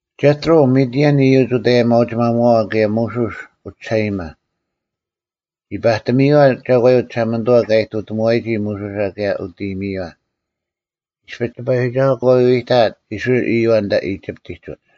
ᒐᑦᕈᐤ, ᒥᑎᐊᓐ ᐃᔪᒡ ᐅᑦ ᐊᔭᒥᐊᐅᒋᒪᒧᐛᐛ ᑭᔭ ᒧᓱᔅ ᐅᒋᓴᐃᔨᒪ᙮ ᒋ ᐸᑎᒥᔪᐛ ᒐᒂᔪᐤ ᒋᓴᒪᓂᑐᐛ ᑲ ᐃᑐᑎᒧᐛᔨᒋ ᒧᓱᓴ ᑭᔭ ᐅᑦ ᐃᔨᒥᔪᐛ᙮ ᐃᔅᐱ ᑎᐸᔨᒋᒐᓱᐤ ᑲ ᐎᐎᑕᐊᑦ ᐃᔅᕋᐃᓪ ᐃᔪᐛ ᐊᓐᑕ ᐃᒋᑉᑎᒡ ᐅᒡ᙮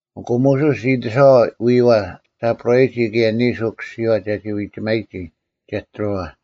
ᐊᑯ ᒧᓱᔅ ᒋ ᐃᑎᓴᐛᐤ ᐎᐛ ᓯᐳᕋᔨᒋ ᑭᔭ ᓂᓱ ᐅᑯᓯᔨᐛ ᒐᒋ ᐎᒋᒪᔨᒋ ᒐᑦᕈᐛ᙮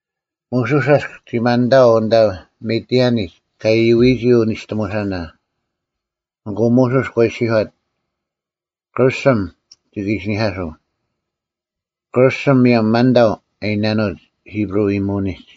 ᒧᓱᔅ ᐊᔅᒃ ᒋ ᒪᓐᑕᐤ ᐊᓐᑕ ᒥᑎᐊᓂᒡ ᑲ ᐃᔪᐎᔨᒋ ᐅᓂᔅᑎᒧᓴᓇ, ᐊᑯ ᒧᓱᔅ ᒂ ᐃᔅᒋᔄᑦ, “ᑭᕐᓱᒻ ᒋᑭ ᐃᓯᓂᐧᑲᓱᐤ᙮ ᑭᕐᓱᒻ ᒧᔭᒻ ‘ᒪᓐᑕᐤ’ ᐊ ᐃᓇᓄᐅᒡ ᐃᑉᕈᐤ ᐃᔨᒧᐅᓂᒡ᙮”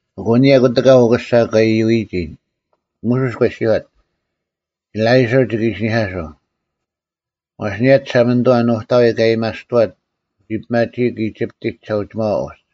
ᐊᑯ ᐊᓂᔭ ᑯᑎᑲ ᐅᑯᓴ ᑲ ᐃᔪᐎᔨᒋ, ᒧᓱᔅ ᒂ ᐃᔅᒋᔄᑦ, “ᐃᓕᐃᓱᕐ ᒋᑭ ᐃᓯᓂᐧᑲᓱᐤ, ᐛᔅ ᐊᓂᔭ ᒋᓴᒪᓂᑐᐛ ᓄᑕᐎᔾ ᑲ ᐊᔭᒥᐊᔅᑐᐛᑦ ᓂᒋ ᐱᒪᒋᐃᒄ ᐃᒋᑉᑎᒡ ᒋᓴᐅᒋᒪᐛ ᐅᒡ᙮”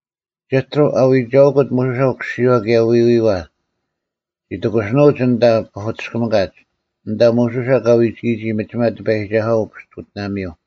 ᒐᑦᕈᐤ, ᐊᐎᒐᐅᑯᑦ ᒧᓱᓴ ᐅᑯᓯᔪᐛ ᑭᔭ ᐎᐎᐛ, ᒋ ᑎᑯᓯᓄᐅᒡ ᐊᓐᑕ ᐸᐧᑯᑎᔅᑭᒥᑲᒡ, ᐊᓐᑕ ᒧᓱᓴ ᑲ ᐎᒋᔨᒋ ᒥᒋᒪ ᑎᐸᔨᒋᒐᓱᐛ ᐅᐱᔅᑯᑎᓇᒥᔪᐤ᙮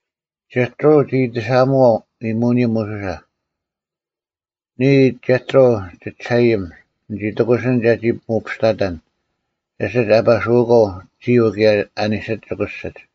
ᒐᑦᕈᐤ ᒋ ᐃᑎᓴᒧᐛᐤ ᐃᔨᒧᐅᓂᔪᐤ ᒧᓱᓴ, “ᓂᔾ, ᒐᑦᕈᐤ ᒋᒋᓴᐃᔨᒻ, ᓂᒋ ᑎᑯᓯᓐ ᒐᒋ ᒧᐱᔅᑕᑕᓐ ᐊᓯᒡ ᐊᐸᓱᐅᒂᐤ ᒋᔪᐤ ᑭᔭ ᐊ ᓂᓯᒡ ᒋᑯᓯᒡ᙮”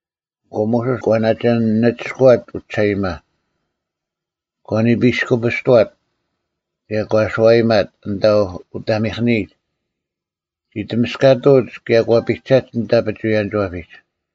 ᐊᑯ ᒧᓱᔅ ᒂ ᓇᒋ ᓂᒋᔅᑯᐛᑦ ᐅᒋᓴᐃᔨᒪ, ᒂ ᓂᐱᔅᑯᐱᔅᑐᐛᑦ ᑭᔭ ᒂ ᓱᐛᔨᒪᑦ ᐊᓐᑕ ᐅᑕᒥᐧᑭᓂᒡ᙮ ᒋ ᑎᒥᔅᑲᑐᐅᒡ ᑭᔭ ᒂ ᐱᒐᒡ ᐊᓐᑕ ᐱᒍᐎᔭᓂᒋᐛᐱᒡ᙮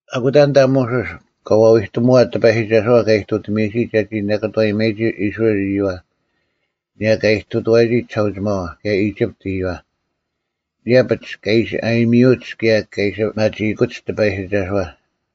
ᐊᑯᑕ ᐊᓐᑕ ᒧᓱᔅ ᑲ ᐛᐎᑎᒧᐛᑦ ᑎᐸᔨᒋᒐᓱᐛ ᑲ ᐃᑐᑎᒥᔨᒋ ᒐᒋ ᓇᑭᑐᐛᔨᒪᔨᒋ ᐃᔅᕋᐃᓪ ᐃᔪᐛ ᐊᓂᔭ ᑲ ᐃᑐᑐᐛᔨᒋ ᒋᓴᐅᒋᒪᐛ ᑭᔭ ᐃᒋᑉᑎᒡ ᐃᔪᐛ᙮ ᐃᔭᐱᒡ ᑲ ᐃᓯ ᐊᔨᒥᔪᐅᒡ ᑭᔭ ᑲ ᐃᓯ ᐱᒪᒋᐃᑯᒡ ᑎᐸᔨᒋᒐᓱᐛ᙮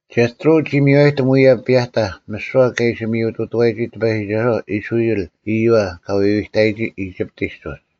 ᒐᑦᕈᐤ ᒋ ᒥᔽᔨᑎᒻ ᐅᔭ ᐱᔭᑕᐧᒃ ᒥᓯᐛ ᑲ ᐃᓯ ᒥᔪᑐᑐᐛᔨᒋ ᑎᐸᔨᒋᒐᓱᐛ ᐃᔅᕋᐃᓪ ᐃᔪᐛ ᑲ ᐎᐎᑕᔨᒋ ᐃᒋᑉᑎᒡ ᐅᒡ᙮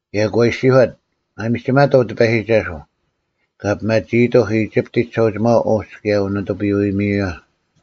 ᑭᔭ ᒂ ᐃᔅᒋᔄᑦ, “ᒪᒥᒋᒪᑕᐤ ᑎᐸᔨᒋᒐᓱᐤ, ᑲ ᐱᒪᒋᐃᑕᐧᒄ ᐃᒋᑉᑎᒡ ᒋᓴᐅᒋᒪᐛ ᐅᒡ ᑭᔭ ᐅᓂᑐᐱᔪᐅ-ᐃᔨᒥᔪᐛ᙮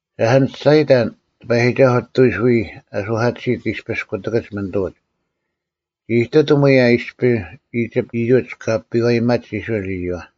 ᓴᔅ ᓂᒋ ᒋᔅᒐᔨᑕᓐ ᑎᐸᔨᒋᒐᓱᐤ ᐊᑐᐎᔅ ᐎᔾ ᐊᓱᐧᑲᑎᓯᑦ ᐃᔅᐱᔅ ᑯᑎᑭᒡ ᒥᓂᑐᐅᒡ᙮ ᒋ ᐃᑐᑎᒻ ᐅᔭ ᐃᔅᐱ ᐃᒋᑉᑦ ᐃᔪᒡ ᑲ ᐱᐛᔨᒪᒡ ᐃᔅᕋᐃᓪ ᐃᔪᐛ᙮”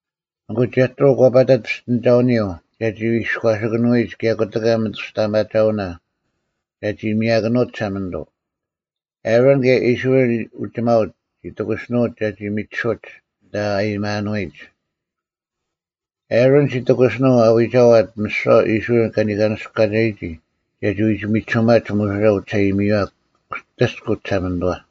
ᐊᑯ ᒐᑦᕈᐤ ᒂ ᐸᑕᑦ ᐱᔅᑎᓂᒐᐅᓂᔪᐤ ᒐᒋ ᐃᔎᓴᑭᓄᐎᒡ ᑭᔭ ᑯᑎᑲ ᒥᑐᔅᑕᐊᒪᒐᐅᓇ ᒐᒋ ᒥᔭᑭᓄᐅᑦ ᒋᓴᒪᓂᑐᐤ᙮ ᐊᕋᓐ ᑭᔭ ᐃᔅᕋᐃᓪ ᐅᒋᒪᐅᒡ ᒋ ᑎᑯᓯᓄᐅᒡ ᒐᒋ ᒥᒋᓱᐅᒡ ᐊᓐᑕ ᐊᔭᒥᐊᓄᐎᒡ᙮ ᐊᕈᓐ ᒋ ᑎᑯᓯᓄᐤ ᐊ ᐎᒐᐛᑦ ᒥᓯᐛ ᐃᔅᕋᐃᓪ ᐅᒋᒪᐅᒡ ᒐᒋ ᐎᒋᒥᒋᓱᒪᒡ ᒧᓱᓴ ᐅᒋᓴᐃᒥᔪᐛ ᐅᑎᔅᑯᐤ ᒋᓴᒪᓂᑐᐛ᙮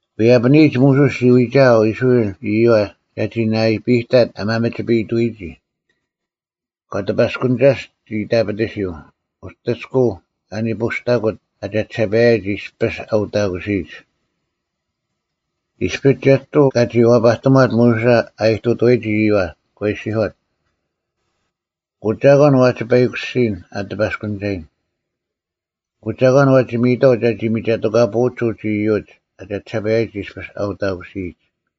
ᐎᔭᐱᓂᔨᒡ ᒧᓱᔅ ᒋ ᐎᒋᐊᐤ ᐃᔅᕋᐃᓪ ᐃᔪᐛ ᒐᒋ ᓇᐃᐱᑕᑦ ᐊ ᒪᒥᒋᐱᔨᑐᐎᒋ᙮ ᑲ ᑎᐸᔅᑯᓂᒐᔅᑦ ᒋ ᐃᑕᐱᑎᓯᔪᐤ, ᐅᑎᔅᑯᐤ ᐊᓂᐳᔅᑕᑯᑦ ᐊ ᒐᒋᓴᐸᔨᒡ ᐃᔅᐱᔅ ᐊ ᐅᑕᑯᓯᔨᒡ᙮ ᐃᔅᐱ ᒐᑎᕈᐤ ᑲᒋ ᐛᐸᑎᒺᑦ ᒧᓱᓴ ᐊ ᐃᑐᑐᐛᔨᒋ ᐃᔪᐛ, ᒂ ᐃᔅᒋᔄᑦ, “ᐊᑯ ᒐᒂᓐ ᐛᒋ ᐸᐃᑯᓯᔨᓐ ᐊ ᑎᐸᔅᑯᓂᒐᔨᓐ? ᐊᑯ ᒐᒂᓐ ᐛᒋ ᒥᔨᑥᐤ ᒐᒋ ᒥᒐᑎᑲᐳᐅᒡ ᐅᒡ ᐃᔪᒡ ᐊ ᒐᒋᓴᐸᔨᒡ ᐃᔅᐱᔅ ᐊᐅᑕᑯᓯᔨᒡ?”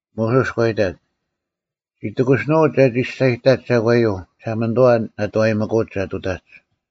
ᒧᓱᔅ ᒂ ᐃᑕᑦ, “ᒋ ᑎᑯᓯᓄᐅᒡ ᒐᒋ ᒋᔅᒐᔨᑕᒡ ᒐᒂᔪᐤ ᒋᓴᒪᓂᑐᐛ ᓇᑐᐛᔨᒥᑯᒡ ᒐ ᑐᑕᒡ᙮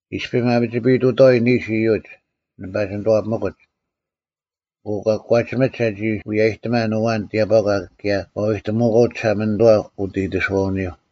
ᐃᔅᐱ ᒪᒥᒋᐱᐃᑐᑥᐎ ᓂᓱ ᐃᔪᒡ, ᓂ ᐸᒋ ᓂᑐᐛᐱᒥᑯᒡ, ᐊᑯ ᒂ ᑯᒂᒋᒥᒡ ᒐᒋ ᐎᔭᔨᑎᒪᓐ ᐊᐛᓐ ᑎᔭᑈᒂ ᑭᔭ ᒂ ᐎᑎᒧᐅᒂᐤ ᒋᓴᒪᓂᑐᐛ ᐅᑦ ᐃᑎᓱᐛᐅᓂᔪᐤ᙮”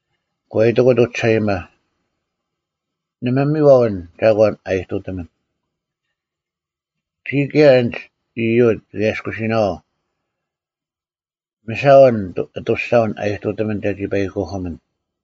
ᒂ ᐃᑎᑯᑦ ᐅᒋᓴᐃᔨᒪ, “ᓇᒪ ᒥᔽᐤ ᐊᓐ ᒐᒂᓐ ᐊ ᐃᑐᑎᒥᓐ᙮ ᒋᔾ ᑭᔭ ᐊᓐᒡ ᐃᔪᒡ ᒋᑭ ᐊᔭᔅᑯᓯᓇᐛᐤ᙮ ᒥᓴᐤ ᐊᓐ ᐊᑐᔅᒐᐅᓐ ᐊ ᐃᑐᑎᒥᓐ ᒐᒋ ᐸᐃᑯᐧᑭᒥᓐ᙮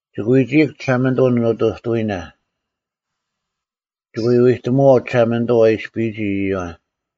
ᒋᑭ ᐎᒋᐃᒄ ᒋᓴᒪᓂᑐᐤ ᓂᑐᑐᐎᓇ᙮ ᒋᑭ ᐎ ᐎᑎᒧᐛᐤ ᒋᓴᒪᓂᑐᐤ ᐊ ᐃᔅᐱᔨᒋ ᐃᔪᐛ᙮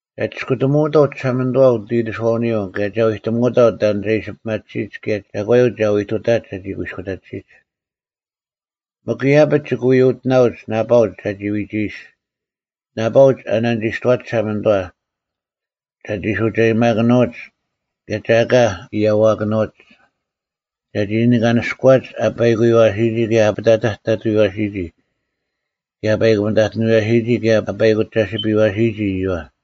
ᒐ ᒋᔅᑯᑎᒧᐅᑥᐤ ᒋᓴᒪᓂᑐᐛ ᐅᑦ ᐃᑎᓱᐛᐅᓂᔪᐤ ᑭᔭ ᒐ ᐎᑎᒧᐅᑥᐤ ᑕᓐ ᒐ ᐃᓯ ᐱᒪᑎᓯᒡ ᑭᔭ ᒐᒂᔪᐤ ᒐ ᐎ ᑐᑕᒡ ᒐᒋ ᑯᐃᔅᑯᑕᑎᓯᒡ᙮ ᒥᒄ ᐃᔭᐱᒡ, ᒋᑭ ᐎ ᐅᑎᓇᐅᒡ ᓇᐸᐅᒡ ᒐᒋ ᐎᒋᐃᔅᒡ, ᓇᐸᐅᒡ ᐊ ᓇᓂᒋᔅᑐᐛᒡ ᒋᓴᒪᓂᑐᐛ, ᒐᒋ ᓱᒐᔨᒪᑭᓂᐅᒡ ᑭᔭ ᒐ ᐊᑲ ᐃᔭᐛᑭᓄᐅᒡ᙮ ᒐᒋ ᓂᑲᓂᔅᑯᐛᒡ ᐊ ᐸᐃᑯᔪᐛᓯᔨᒋ ᑭᔭ ᐊ ᐱᑕᑕᑐᔪᐅᐛᓯᔨᒋ, ᑭᔭ ᐊ ᐸᐃᑯᒥᑕᓯᒥᑎᓄᐛᓯᔨᒋ ᑭᔭ ᐊ ᐸᐃᑯᒐᓯᐱᔪᐛᓯᔨᒋ ᐃᔪᐛ᙮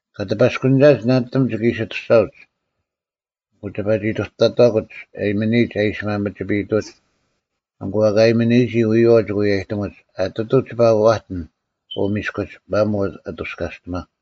ᑲᑎᐸᔅᑯᓂᒐᒡ ᓇᓂᑎᒻ ᒋᑭ ᐃᓯ ᐊᑐᔅᒐᐅᒡ᙮ ᐊᑯ ᒋᐸ ᐃᑐᑕᑕᑯᒡ ᐊᔨᒥᓂᔨᒡ ᐊ ᐃᓯ ᒪᒥᒋᐱᐃᑐᒡ, ᐊᑯ ᐊᑲ ᐊᔨᒥᓂᔨᒋ ᐎᔨᐛᐤ ᒋᑭ ᐎᔭᔨᑎᒧᒡ᙮ ᐊᑎᑐᐤ ᒋᐸ ᐛᑎᓐ ᐅ ᒥᔅᑯᒡ, ᒪᒧᐤ ᐊᑐᔅᑲᔅᑎᒪᒄ᙮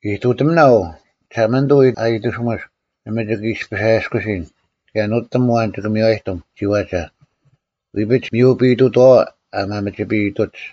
ᐃᑐᑎᒥᓇ ᐅ, ᒋᓴᒪᓂᑐᐤ ᐊ ᐃᑎᓱᒥᔅᒃ, ᓇᒪ ᒋᑭ ᐃᔅᐱᔅ ᐊᔭᔅᑯᓯᓐ, ᑭᔭ ᓄᑎᒻ ᐊᐛᓐ ᒋᑭ ᒥᔽᔨᑎᒻ ᒋᐛᒐ, ᐎᐱᒡ ᒥᔪᐱᐃᑐᑥᐛ ᐊ ᒪᒥᒋᐱᐃᑐᒡ᙮”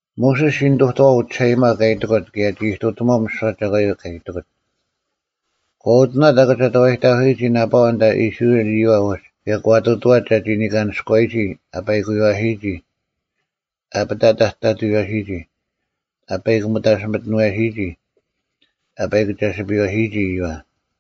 ᒧᓱᔅ ᒋ ᓂᑐᑐᐛᐤ ᐅᒋᓴᐃᔨᒪ ᑲ ᐃᑎᑯᑦ ᑭᔭ ᒋ ᐃᑐᑎᒺᐤ ᒥᓯᐛ ᒐᒂᔪᐤ ᑲ ᐃᑎᑯᑦ᙮ ᒂ ᐅᑎᓇᑦ ᐊᑭᒐᑕᐛᔨᑕᑯᓯᔨᒋ ᓇᐸᐛ ᐊᓐᑕ ᐃᔅᕋᐃᓪ ᐃᔪᐛ ᐅᒡ ᑭᔭ ᒂ ᑐᑐᐛᑦ ᒐᒋ ᓂᑲᓂᔅᑯᐛᔨᒋ ᐊ ᐸᐃᑯᔪᐛᓯᔨᒋ, ᐊ ᐱᑕᑕᑐᔪᐅᐛᓯᔨᒋ, ᐊ ᐸᐃᑯᒥᑕᓯᒥᑎᓄᐛᓯᔨᒋ, ᐊ ᐸᐃᑯᒐᓯᐱᔪᐛᓯᔨᒋ ᐃᔪᐛ᙮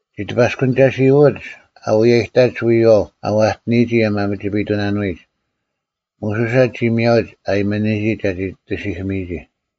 ᒋ ᑎᐸᔅᑯᓂᒐᓯᐅᐎᒡ ᐊᐎᔭᔨᑕᒡ ᐎᔪᐛᐤ ᐊ ᐛᑎᓂᔨᒋ ᐊ ᒪᒥᒋᐱᐃᑐᓇᓄᐎᒡ, ᒧᓱᓴ ᒋᒥᔭᐅᒡ ᐊ ᐊᒥᓂᔨᒋ ᒐᒋ ᑎᓯᐧᑭᒥᔨᒋ᙮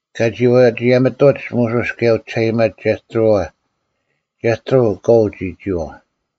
ᑲᒋ ᐛᒋᔭᒥᑐᒡ ᒧᓱᔅ ᑭᔭ ᐅᒋᓴᐃᔨᒪ ᒐᑦᕈᐛ᙮ ᒐᑦᕈᐤ ᑲᐤ ᒋ ᒋᐛᐤ᙮